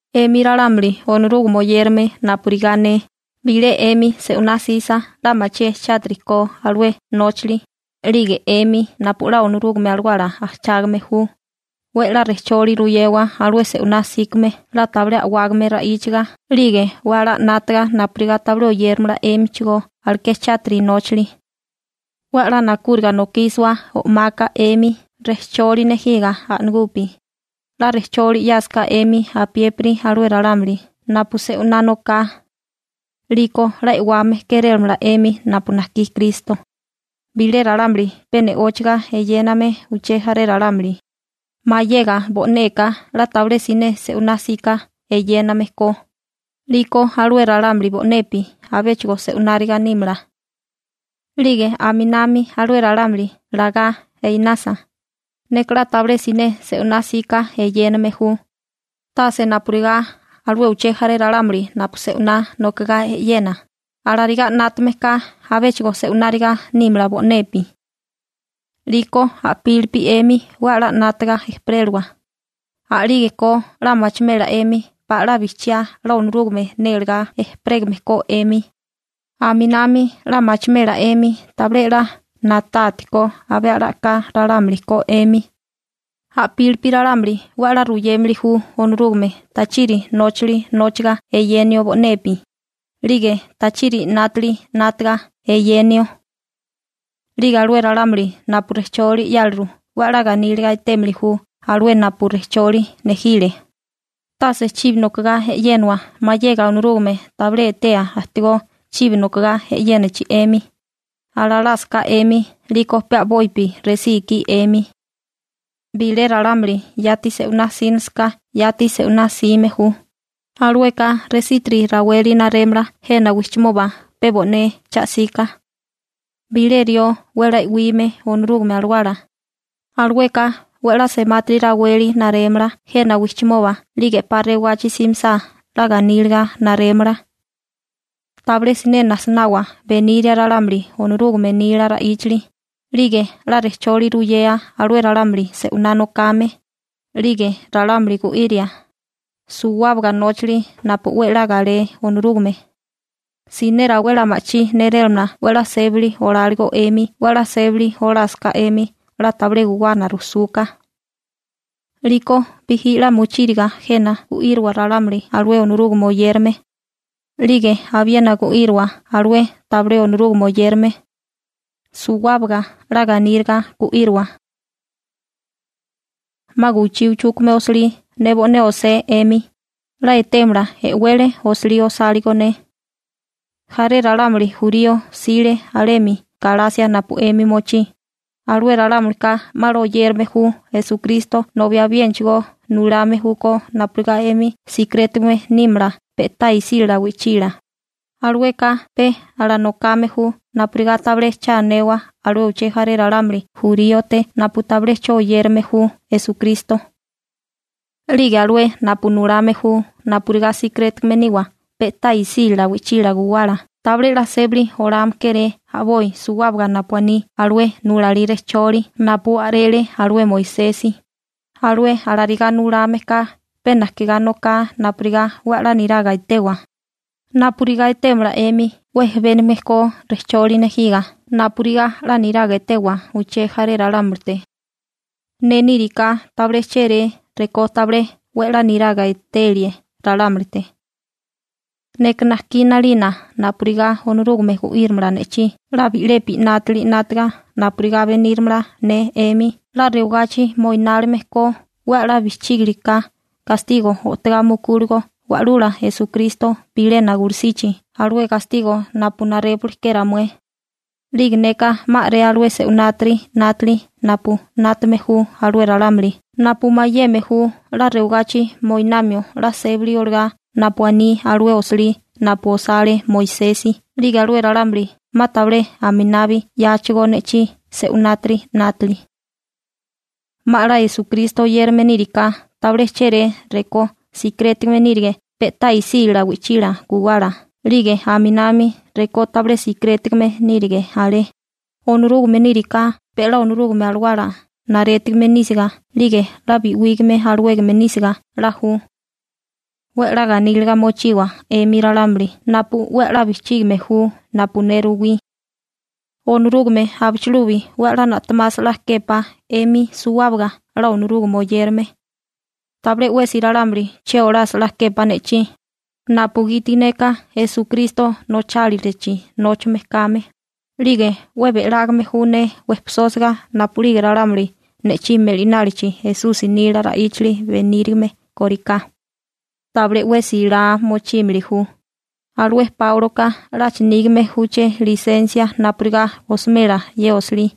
'Emi ralámuli Onorúgame oyérame napurigá ne, bilé 'emi se'winá 'sisa 'la machié chátiri ko alué nóchali, 'lige 'emi napu 'la Onorúgame Alawala ajchágame ju, 'we 'la rejcholi ruyewa alué se'winá 'síkame 'la tabilé a'wágame ra'íchaga 'lige 'we 'la 'nátaga napurigá tabilé oyéramala 'émichigó aleké chátiri nóchali. 'We 'la nakúriga nokísiwa o'maka 'emi rejcholi nejiga a'nagupi, 'la rejcholi 'yásaká 'emi apiépiri alué ralámuli napu se'winá noká, 'liko 'la e'wame kérélamala 'emi napu najkí Kristo. Bilé ralámuli pe ne'óchaga eyéname uché jaré ralámuli, mayega bo'neka 'la tabilé siné se'winá 'sika eyéname ko, 'liko alué ralámuli bo'nepi abéchigo se'wináriga nímala. 'Lige aminami alué ralámuli lagá einasa: «Neka 'la tabilé siné se'winá 'sika eyéname ju, tase napurigá alué uché jaré ralámuli napu se'winá nokagá e'yena», alarigá 'nátame ka abéchigo se'wináriga nímala bo'nepi. 'Liko a'pílipi 'emi 'we 'la 'nátaga ejperélawa, a'lígeko 'la machimela 'emi pala 'la bijchiá 'la Onorúgame nélegá ejperégame ko 'emi, aminami 'la machimela 'emi tabilé na'tátikó abé a'lá a'ká ralámuli ko 'emi. A'pílipi ralámuli 'we 'la ruyémili ju Onorúgame tachiri nóchali nóchaga eyéneo bo'nepi, 'lige tachiri 'nátili 'nátaga eyéneo. 'Lige alué ralámuli napu rejcholi 'yáliru 'we 'la ganíliga etémili ju alué napu rejcholi nejile. Tase chibi nokogá e'yénawa mayega Onorúgame tabilé etéa ajtigó chibi nokagá e'yénachi 'emi, alalásaká 'emi 'liko pe a'bopi resí ikí 'emi. Bilé ralámuli yati se'winá 'sínalisaká yati se'winá 'sime ju, alueka resitiri raweli narémala jena wijchimoba pe bo'né cha'sika. Bilé rió 'we 'la e'wime Onorúgame Alawala, alueka 'we 'la semátiri raweli narémala jena wijchimoba 'lige 'pa rewagachi simisá 'la ganíliga narémala. Tabilé siné najsinawa beniria ralámuli Onorúgame nila ra'íchali, 'lige 'la rejcholi ruyea alué ralámuli se'winá nokame, 'lige ralámuli gu'iria, suwábaga nóchali napu 'we 'la galé Onorúgame. Siné rawé 'la ma'chí nérélamala 'we 'la sébali oláligo 'emi 'we 'la sébali olásaká 'emi 'la tabilé guwana rujsúká. 'Liko bijí 'la mochíriga jena gu'íriwa ralámuli alué Onorúgame oyérame. 'Lige abiena gu'íriwa alué tabilé Onorúgame oyérame, suwábaga 'la ganíliga gu'íriwa. Jena 'ma guwichí chujkúgame osilí ne bo'né osé 'emi, 'la etémala e'wele osilí osáligo ne. Jaré ralámuli jurío jsile alemi Galasia napu 'emi mochí, alué ralámulika 'ma 'la oyérame ju Esukristo nobi abiénachigo nulame júkó napurigá 'emi sikirétigame nímala pe'tá isílala wi'chila, alueka pe alanokame ju napurigá tabilé cha anewa alué uché jaré ralámuli juríote napu tabilé 'cho oyérame ju Esukristo. 'Lige alué napu nulame ju napurigá sikirétigame niwa pe'tá isílala wi'chila guwala tabilé 'la sébali olame kéré a'boi suwábaga napu aní alué nulalí rejcholi napu a'rele alué Moisesi. Alué alarigá nulame ka pe najkigá noká napurigá 'we 'la niraga etewa, napurigá etémala 'emi 'we jebénigame ko rejcholi nejiga napurigá 'la niraga etewa uché jaré ralámulite. Ne níriká tabilé chéré rekó tabilé 'we 'la niraga etelie ralámulite. Neka najkí 'nalina napurigá Onorúgame gu'írimala ne'chí 'la bi'lepi 'nátili 'nátaga napurigá beníramala ne 'emi 'la rewagachi moinálime ko 'we 'la bijchígiliká gastigo o'togá mukúligo Wa'lula Esukristo bilena gulusichi alué gastigo napu narépuli ke ramué. 'Lige neka 'ma a'ré alué se'winátiri 'nátili napu 'nátame ju alué ralámuli napu mayeme ju 'la rewagachi moinamio 'la sébali olagá napu aní alué osilí napu osale Moisesi 'lige alué ralámuli 'ma tabilé aminabi 'yáachigó ne'chí se'winátiri 'nátili. 'Ma 'la Esukristo oyérame níriká tabilé chéré rekó sikirétigame nírige pe'tá isílala wi'chila guwala 'lige aminami rekó tabilé sikirétigame nírige alé, Onorúgame níriká pe 'la Onorúgame Alawala narétigime nísiga 'lige 'la bi'wígame alawégame nísiga 'la ju. 'We 'la ganíliga mochiwa 'emi ralámuli napu 'we 'la bijchígime ju napu ne ruwí. Onorúgame abichilubi 'we 'la na'temasa 'la képá 'emi suwábaga 'la Onorúgame oyérame. Tabilé 'wesi ralámuli che olasa 'la képá ne'chí, napugiti neka Esukristo nochálilachi nóchame kame, 'lige 'we be'lágame ju ne wejpisósiga napu'lige ralámuli ne'chí me'linálichi Esusi nila ra'íchali benírime kóriká. Tabilé 'wesi laa mochímili ju: Alué Páuloka 'lacha nígame júché lisensia napurigá osimela ye osilí.